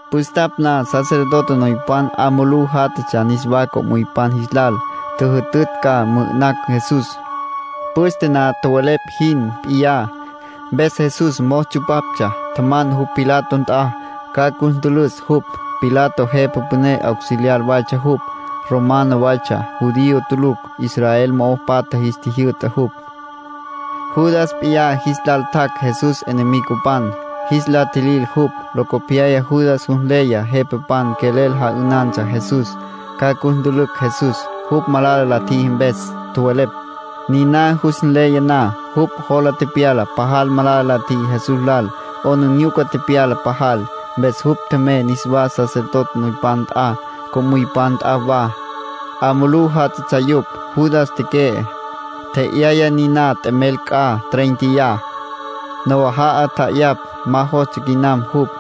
Püstapj na sacerdote noypan 'a mulú játjatsja niswá co'müypan jis lal. Tjüjütütj ca mü'ü'nacj Jesús, püste na tjowelepj jin p'iyá. Mpes Jesús mos tsupaptsja. Tjaman jupj Pilato nt'a, ca cus ntülüs jupj. Pilato jepa püné auxiliar waytsja jupj. Romano waytsja, judío tulucj. Israel mo'o patja jis tjijyü'ta jupj. Judas p'iyá jis lal tjac' Jesús enemigopan, jis la tjilil jupj. Locopyaya Judas jus nleya jepapan quelel ja'ünantsja Jesús. Ca cus ntülücj Jesús, jupj malala la tjiji mpes, tjowelepj. Niná jus nleya na, jupj jola tepyala pajal malala la tjiji Jesús lal. 'Aplijila tepyala pajal. Mpes jupj tjemey niswá sacerdote noypan nt'a, co'müypan nt'a wa. 'A mulú játjatsja yupj. Judas teque'e, tje'yaya niná t'emel c'a tréinteya, nawaja'a tja'ayapj. Ma jostsja quinam jupj.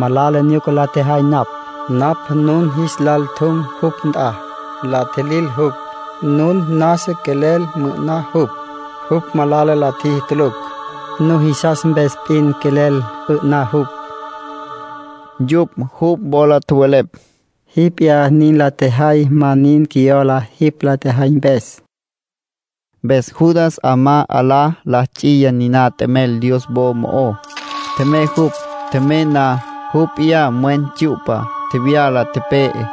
—Malala nyuca la tjejay napj —tjevele jupj—. Napj nun jis lal tjum jupj nt'a, la tjilil jupj. Nun nasa quelel mü'ü'ná jupj. Jupj malala la tjiji tulucj, nujisas mpes p'in quelel 'ü'ná jupj —tjevele. Yupj jupj wola tjowelepj: —Jipj p'iyá nin la tjejay. Ma nin qjuiyola jipj la tjejay mpes —nin tjowelepj yupj. Mpes Judas 'amá 'alá la ts'iya niná t'emel Dios wo mo'ó. Tjemey jupj. Tjemey na, jupj p'iyá mwen tsyu'pa tjevyala, tepe'e.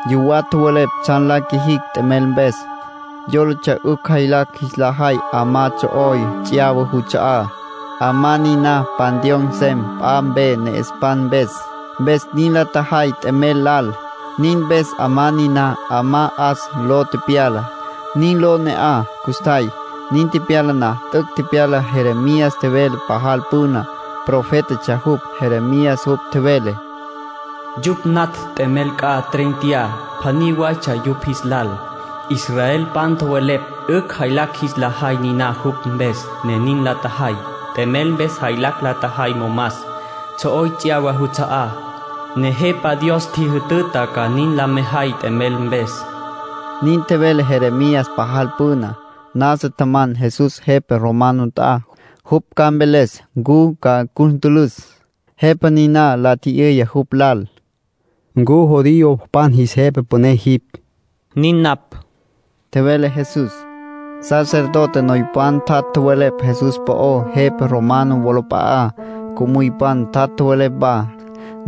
Yuwá tjowelepj tsjan la qjuijicj t'emel mpes. Yólatsja 'ücj jaylacj jis la jay 'amá tsjo'oy ts'yawa juts'a'á. 'Amá niná panteón nsem p'a mpe ne'espan mpes. Mpes nin la tjajay t'emel lal. Nin mpes 'amá niná “'Amá 'As” ló tepyala. Nin ló ne'aj custjay. Nin tepyala na, t'üc' tepyala Jeremías tjevele pajal püna. Profétatsja jupj, Jeremías. Jupj tjevele: “Yupj natj t'emel c'a treinteyá. Pjaní waytsja yupj jis lal. Israelpan tjowelepj 'ücj jaylacj jis la jay niná jupj mpes, ne nin la tjajay. T'emel mpes jaylacj la tjajay momas, tsjo'oy ts'yawa juts'a'á. Nejepa Dios ntjijütüta ca nin la mejay t'emel mpes.” Nin tjevele Jeremías pajal püna. Nasa tjaman Jesús jepa romano nt'a, jupj ca mveles ncu ca cus ntülüs. Jepa niná la tji'yüya jupj lal: —¿Ncu judiopan jis jepa püné jipj? —Nin napj —tjevele Jesús. Sacerdote noypan tjat' tjowelepj Jesús po'ó jepa romano wolap'a'á. Co'müypan tjat' tjowelepj wa.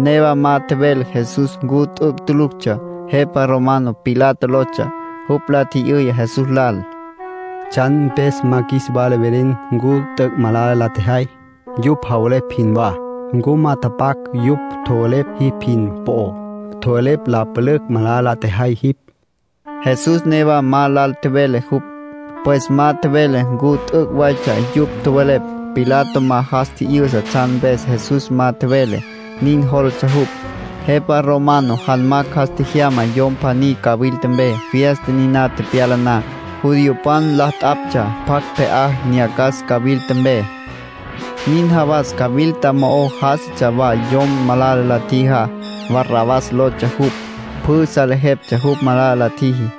Newa ma tjevele Jesús ncu t'üc' tuluctsja. Jepa romano Pilato lotsja. Jupj la tji'yüya Jesús lal: —¿Tsjan mpes ma qjuis wala velen ncu t'üc' malala la tjejay, yupj javelepj jinwá? ¿Ncu ma tjapjac' yupj tjowelepj jipj jin po'ó? Tjowelepj la pülücj malala la tjejay jipj. Jesús newa ma lal tjevele jupj. Pues ma tjevele ncu t'üc' waytsja yupj tjowelepj. Pilato ma jas tji'yüsa tsjan mpes Jesús ma tjevele. Nin jólatsja jupj. Jepa romano janmacj jas tjejyama yom pjaní cawilta mpe fiesta niná tepyala na. Judiopan la t'aptsja pjacj pje'á nyacas cawilta mpe. Nin jawas cawilta mo'o já'asatsja wa yom malala la tjijá. Barrabás lotsja jupj. Pjü salejeptsja jupj malala la tjiji.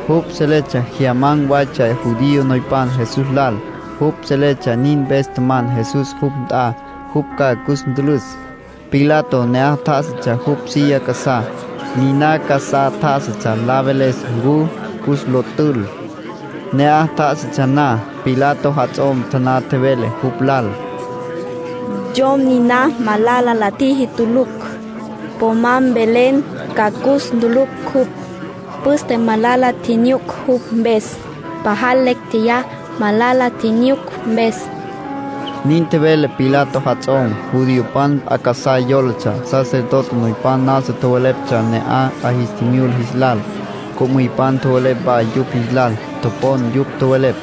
Jupj seletsja jyaman̈ waytsja judío noypan Jesús lal. Jupj seletsja nin mpes tjaman Jesús jupj nt'a, jupj ca cus ntülüs. Pilato ne'aj tjá'asatsja jupj silla casá, niná casá tjá'asatsja la veles ncu cus lo tül. Ne'aj tjá'asatsja na, Pilato jats'om taná tjevele jupj lal: “Yom niná malala la tjiji tulucj. Po ma mvelen ca cus ntülücj jupj. Püste malala tjinyuc jupj mpes. Pajal lecj tjeyá malala tjinyuc mpes.” Nin tjevele Pilato jats'om. Judiopan p'a casá yólatsja. Sacerdote noypan nasa tjoweleptsja ne'aj 'a jis tjimyula jis lal. Co'müypan tjowelepj wa yupj jis lal. Topon yupj tjowelepj.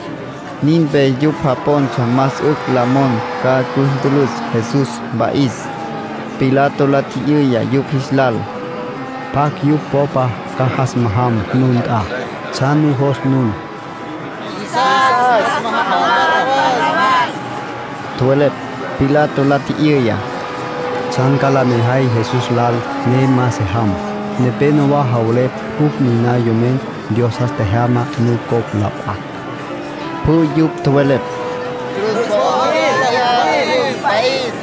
Nin mpes yupj japontsja más 'ücj la mon ca cus ntülüs Jesús, mpa'is. Pilato la tji'yüya yupj jis lal: —¿Pjacj yupj popa ca jas majam nun nt'a? ¿Tsjan nujos nun? —Qjuisas ca jas majaman Barrabás —tjowelepj. Pilato la tji'yüya: —¿Tsjan ca la mejay Jesús lal, ne ma se jam? Nepénowa javelepj jupj niná Yomen Dios jas tjejyama nucopj la p'acj. Pjü yupj tjowelepj: —Cruz po'o tjevyala jupj, mpa'is.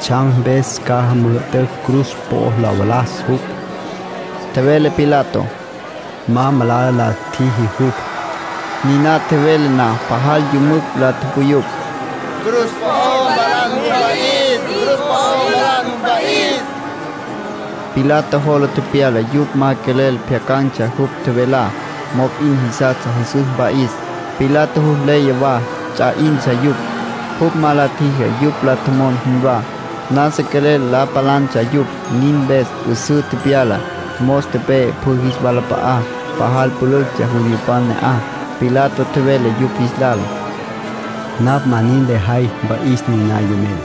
—¿Tsjan mpes ca müjütütj cruz po'o lo valas jupj? —tjevele Pilato—. Ma malala la tjiji jupj. Niná tjevele na, pajal yümücj la tupuyupj: —Cruz po'o mvalan jupj, mpa'is. Pilato jola tepyala yupj ma quelel pjyacan̈tsja jupj tjevelá. Mop'in jisastsja Jesús mpa'is. Pilato jus nleya wa ts'a 'intsja yupj, jupj ma la tjiji yupj la tjomon jinwá. Nasa quelel la palantsja yupj. Nin mpes 'üsǘ tepyula, mos tepe'e pjü jis walap'a'á. Pajal pülüctsja judiopan ne'aj. Pilato tjevele yupj jis lal: —Napj ma nin lejay mpa'is niná yomen.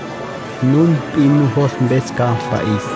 Nun p'in nujos mpes ca mpa'is.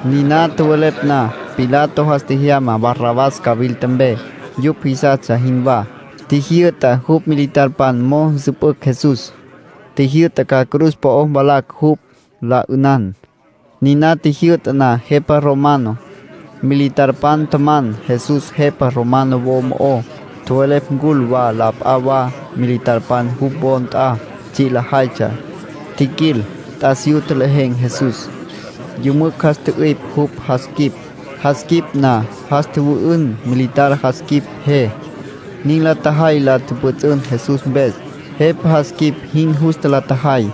Niná tjowelepj na, Pilato jas tjejyama Barrabás cawilta mpe, yupj jisastsja jinwá. Tjijyü'ta jupj militarpan mo'o nsüpücj Jesús. Tjijyü'ta ca cruz po'ó mvalacj jupj, la 'ünan. Niná tjijyü'ta na jepa romano, militarpan tjaman Jesús jepa romano wo mo'ó. Tjowelepj ncul wa la p'a wa militarpan jupj wo nt'a tsji' lajaytsja. Tjiquil, t'asiyú tjelejen̈ Jesús. Yümücj jas tjü'ipj jupj jas quip. Jas tjü'ipj na, jas tjüwü'ün militar jas quip je. Nin la tjajay la pjüts'ün Jesús mpes. Jepa jas quip jin justa la tjajay.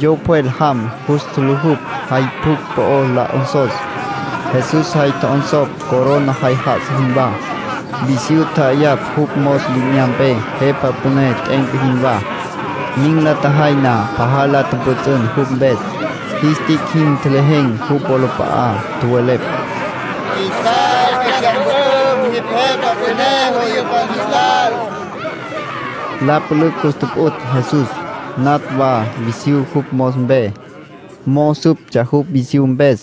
Yo pjwel jam jus tjulujupj jay pjucj po'ó la 'onsos. Jesús jay tjo'onsopj, corona jay já'asa jinwá. Visyú tja'ayapj jupj mos li'inyampe, jepa püné t'e'enca jinwá. Nin la tjajay na, pajal la tjüpjüts'ün jupj mpes. Jis tic' jin tjelejen̈ jupj wolap'a'á. Tjowelepj: —Qjuisas 'ücj jyas mpü'üm. Jipj jepa püné judiopan jis lal. La pülücj cus tjupjuts' Jesús. Natj wa visyú jupj mos mpe, mo'o süptsja jupj visyú mpes.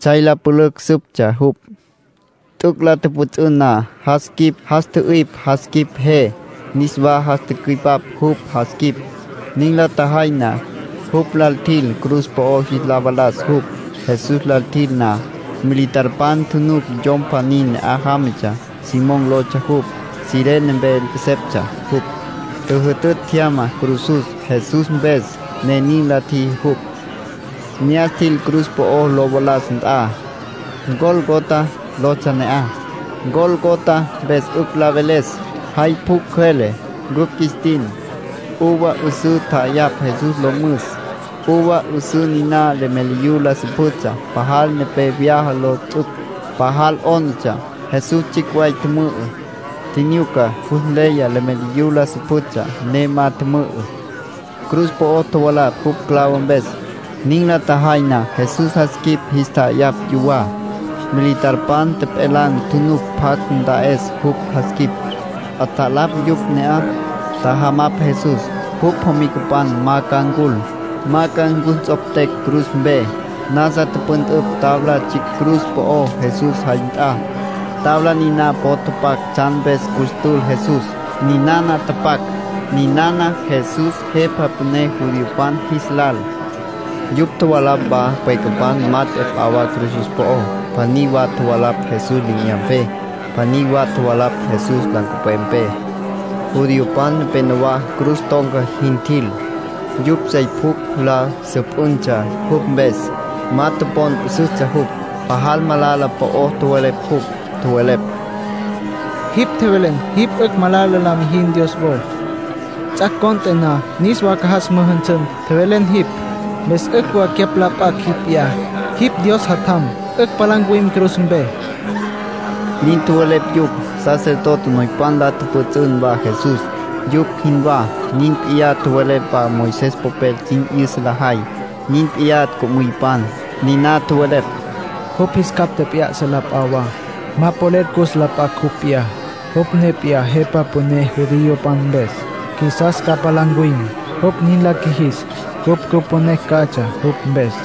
Tsjay la pülücj süptsja jupj. T'üc' la tjüpjüts'ün na, jas tjü'ipj jas quip je. Niswa jas tücüipap jupj jas quip. Nin la tjajay na, jupj lal tjil, cruz po'o jis la valas jupj. Jesús lal tjil na, militarpan tjunuc yom pjaní ne'aj jámatsja. Simón lotsja jupj, Cirene mpe 'eseptsja jupj. Tjüjütütj tjyama cruzus Jesús mpes, ne nin la tjiji jupj. Ne'as tjil cruz po'o lo valas nt'a. Gólgota lotsja ne'aj. “Gólgota” mpes 'ücj la veles “Jay Pjucj Cjüele” cupj qjuis tin. Uva 'üsǘ tja'ayapj Jesús lo müs. Uva 'üsǘ niná leméliyu la süpjütsja, pajal nepé vyaja lo ts'uc. Pajal 'ónatsja. Jesús tsjicj way tjümü'ü, tjinyuca. Jus nleya leméliyu la süpjütsja, ne ma tjümü'ü. Cruz po'o tjovalapj jupj clavo mpes. Nin la tjajay na, Jesús jas quip jis tja'ayapj yuwá. Militarpan tjepjelan̈ tjunuc pjacj nta'es jupj jas quip. 'Atjalapj yupj ne'aj, tjajamapj Jesús, jupj jomicapan ma ca ncul, ma ca cus nts'optecj cruz mpe. Nasa tüpüntüpj tabla tsjicj cruz po'ó Jesús jay nt'a. Tabla niná po'o tapac tsjan mpes cus tül Jesús. Ninana tapac: NINANA JESÚS, JEPA PÜNÉ JUDIOPAN JIS LAL. Yupj tjovalapj wa pwecapan mat'e p'a wa cruzus po'ó. Pjaní wa tjovalapj Jesús li'inyampe. Pjaní wa tjovalapj Jesús nancupwepé. Judiopan nepénowa cruz ton̈ca jin tjil. Yupj sey pjucj la süpjüntsja jupj mpes. Ma topon 'üsüstsja jupj. Pajal malala po'o tjowelepj jupj. Tjowelepj: —Jipj tjevelen jipj 'ücj malala la mijin Dios wo. Ts'ac' cont'e na niswa ca jas müjünsün, tjevelen jipj. Mpes 'ücj wa cyapj la p'acj jipj p'iyá. Jipj Dios Jatjam, 'ücj palá ncuwim cruz mpe —nin tjowelepj yupj. Sacerdote noypan la tjüpjüts'ün wa Jesús, yupj jinwá. Nin p'iyá tjowelepj wa Moisés popel sin 'yüsa lajay. Nin p'iyá co'müypan. Niná tjowelepj: —Jupj jis capj tjep'ya'sa la p'a wa. Ma polel cus la p'acj jupj p'iyá. Jupj ne p'iyá Jepa Püné judiopan mpes, qjuisas ca palá ncuwim. Jupj nin la qjuijis, cupj cüponecj catsja jupj mpes.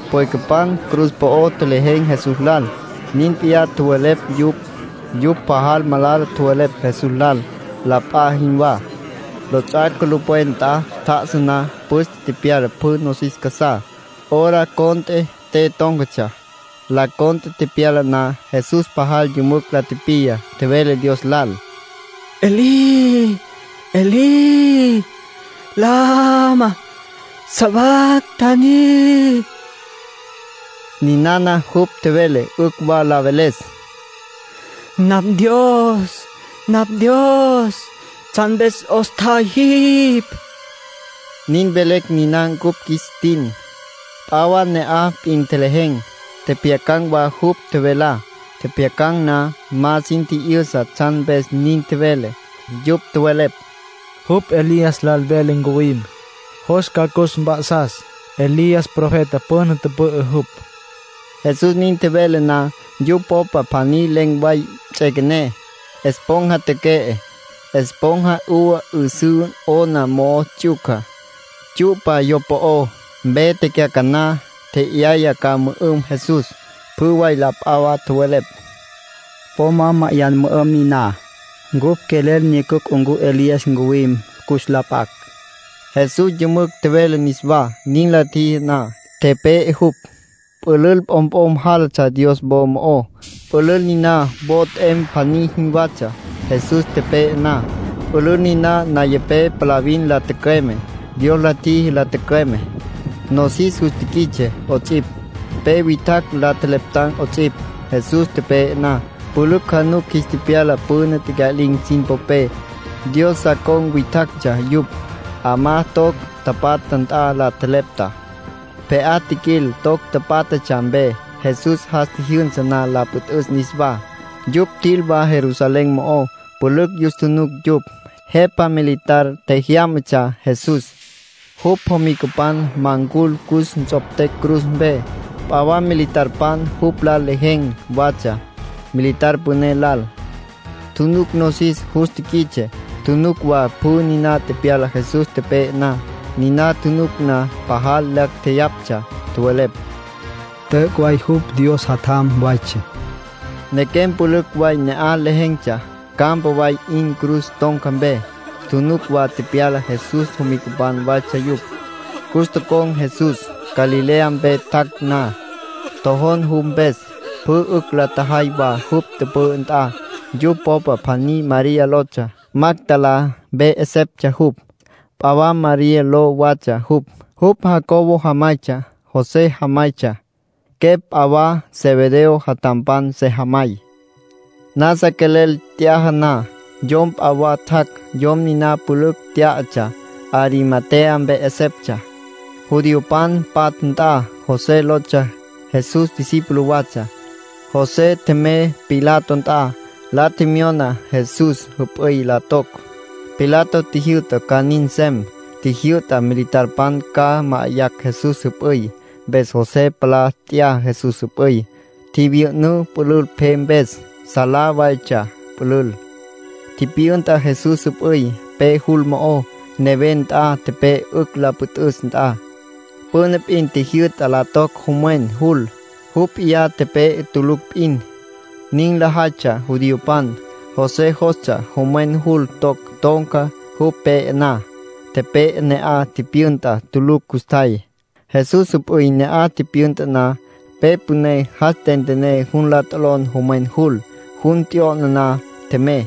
Pwecapan cruz po'o tjelejen̈ Jesús lal, nin p'iyá tjowelepj yupj. Yupj pajal malala tjowelepj Jesús lal, la p'a jinwá. Lots'ac' culupwen nt'a tjá'asa na, püste tepyala pjü nosis casá. Hora cont'e te tón̈catsja. Las tres tepyala na, Jesús pajal yümücj la tipiya, tjevele Dios lal: —Elí, Elí, ¿lama sabactani? —tjevele jupj. (Ninana jupj tjevele 'ücj wa la veles: “Napj Ndios, napj Ndios, ¿tsjan mpes 'os tjay jipj?” Nin velecj niná cupj qjuis tin.) P'a wa ne'aj p'in tjelejen̈, tjepjyacan̈ wa jupj tjevelá. Tjepjyacan̈ na, ma sin tji'yüsa tsjan mpes nin tjevele. Yupj tjowelepj: —Jupj Elías lal vele ncuwim. Jos ca cus mp'a'sas. Elías profeta püna tüpü'ü jupj. Jesús nin tjevele na, yupj popa pjaní len̈ way ts'üequené, esponja teque'e. Esponja uva 'üsǘ 'ona mo'o ts'yuca, tsyu'pa yo po'ó, mpe tecyacaná. Tje'yaya ca mü'üm Jesús. Pjü way la p'a wa tjowelepj: —Po ma ma'ayan mü'üm niná. Cupj quelel nyucucj ncu Elías ncuwim cus la p'acj. Jesús yümücj tjevele niswá. Nin la tjiji na, tepe'e jupj. Pülül p'omp'om jálatsja Dios wo mo'ó, pülül niná wo t'em pjaní jinwatsja. Jesús tepe'e na, pülül niná nayapé palavin la tücüeme. Dios la tjiji la tücüeme. Nosis jus tiquits'e 'ots'ipj. Pe witjacj la tjeleptan 'ots'ipj. Jesús tepe'e na, pülücj janucun jis tepyala püna tecya'lin̈ sin popé. Dios sa con̈ witjactsja yupj. 'Amá toc tapatja nt'a la tjelepta. Pje'á tjiquil toc pátjatsja mpe. Jesús jas tjijyünsa na la püt'üs niswa, yupj tjil wa Jerusalén mo'ó. Pülücj yus tjunuc yupj. Jepa militar tjejyámatsja Jesús, jupj jomicapan ma ncul cus nts'optecj cruz mpe. P'a wa militarpan jupj lal lejen̈ watsja, militar püné lal. Tjunuc nosis jus tiquits'e. Tjunuc wa pjü niná tepyala Jesús tepe'e na. Niná tjunuc na, pajal lacj tjeyaptsja. Tjowelepj: —T'üc' way jupj Dios Jatjam waytsja. Nequem pülücj way ne'aj lejen̈tsja, campa way 'in cruz ton̈ca mpe. Tjunuc wa tepyalá. Jesús jomicapan waytsja yupj. Cus tocon̈ Jesús, Galilea mpe tjac' na. Tjojon jupj mpes, pjü 'ücj la tjajay wa jupj tüpü'ü nt'a. Yupj popa pjaní María lotsja. Magdalá mpe 'eseptsja jupj. P'a wa María ló watsja jupj. Jupj Jacobo jamaytsja, José jamaytsja. Quepj p'a wa Zebedeo jatjampan sejamay. Nasa quelel t'yaja na, yom p'a wa tjac'. Yom niná pülücj tyá'atsja. Arimatea mpe 'eseptsja, judiopan patja nt'a. José lotsja. Jesús discípulo watsja. José tjemey Pilato nt'a. La tjemyona Jesús jüp'üy la toc. Pilato tjijyü'ta ca nin nsem. Tjijyü'ta militarpan ca ma'ayacj Jesús jüp'üy. Mpes José palá nt'ya Jesús jüp'üy. Tjivyü'ünǘ pülül pje mpes. Salá waytsja pülül. Tipyünta Jesús jüp'üy pe jul mo'ó, neven nt'a, tepe'e 'ücj la püntüs nt'a. Püna p'in tjijyü'ta la toc jomwen jul, jupj p'iyá tepe'e tulucj p'in. Nin lajaytsja judiopan. José jostsja jomwen jul toc ton̈ca jupj pe'e na. Tepe'e ne'aj tipyünta tulucj custjay. Jesús jüp'üy ne'aj tipyünta na, pe püné jas tentené jun la t'olon jomwen jul. Jun t'yo'na na, tjemey.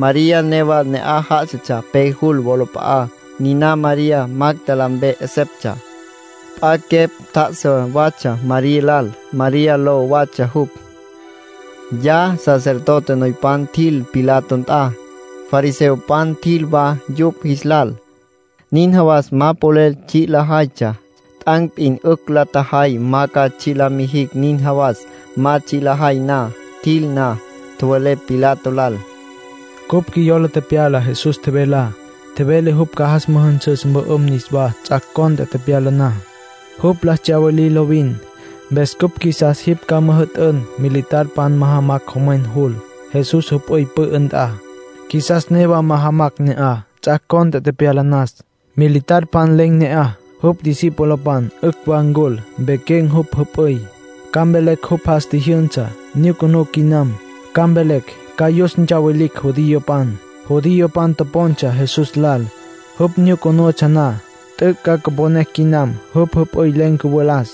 María newa ne'aj já'asatsja pe jul wolap'a'á. Niná María, Magdalá mpe 'eseptsja. P'a quepj tjá'asa watsja María lal. María ló watsja jupj. Ya sacerdote noypan tjil Pilato nt'a. Fariseopan tjil wa yupj jis lal. Nin jawas ma polel tsji' lajaytsja; t'an̈ p'in 'ücj la tjajay ma ca tsji' la mijicj nin jawas ma tsji' lajay na. Tjil na, tjowelepj Pilato lal: —Cupj qjuiyola tepyala Jesús tjevelá. Tjevele jupj ca jas müjünsüs mpü'üm niswá ts'ac' cont'e tepyala na. Jupj la tsyawilitsja lovin. Mpes cupj qjuisas jipj ca müjü'tün militarpan majamacj jomwen jul, Jesús jüp'üy pü'ü nt'a. Qjuisas newa majamacj ne'aj, ts'ac' cont'e tepyala nas. Militarpan len̈ ne'aj, jupj discipulopan 'ücj wa ncul, mpequen̈ jupj jüp'üy. Ca mvelecj jupj jas tjijyünsa. Nyucunú quinam, ca mvelecj. Ca yus ntsawilicj judiopan. Judiopan topontsja Jesús lal, jupj nyucunutsja na. T'üc' ca mponecj quinam, jupj jüp'üy len̈ cüvalas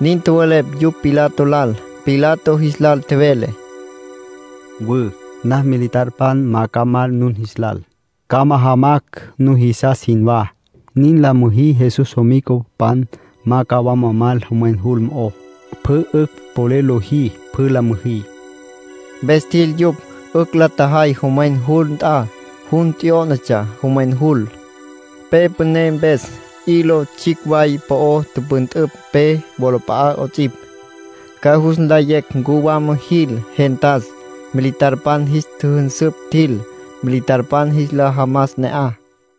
—nin tjowelepj yupj Pilato lal. Pilato jis lal tjevele: —Mwü. Napj militarpan ca mal nun jis lal, ca majamacj nujisas jinwá. Nin la müjí Jesús jomicapan ma ca wama mal jomwen jul mo'ó. Pjü 'ücj polel lojí, pjü la müjí. Mpes tjil yupj. 'Ücj la tjajay jomwen jul nt'a. Jun t'yó'natsja jomwen jul, pe püné mpes. Hilo tsjicj way po'o tüpüntüpj pe wolap'a'á 'ots'ipj, ca jus nlayecj ncu wama jil gentas. Militarpan jis tjüjünsüpj tjil, militarpan jis la jamas ne'aj.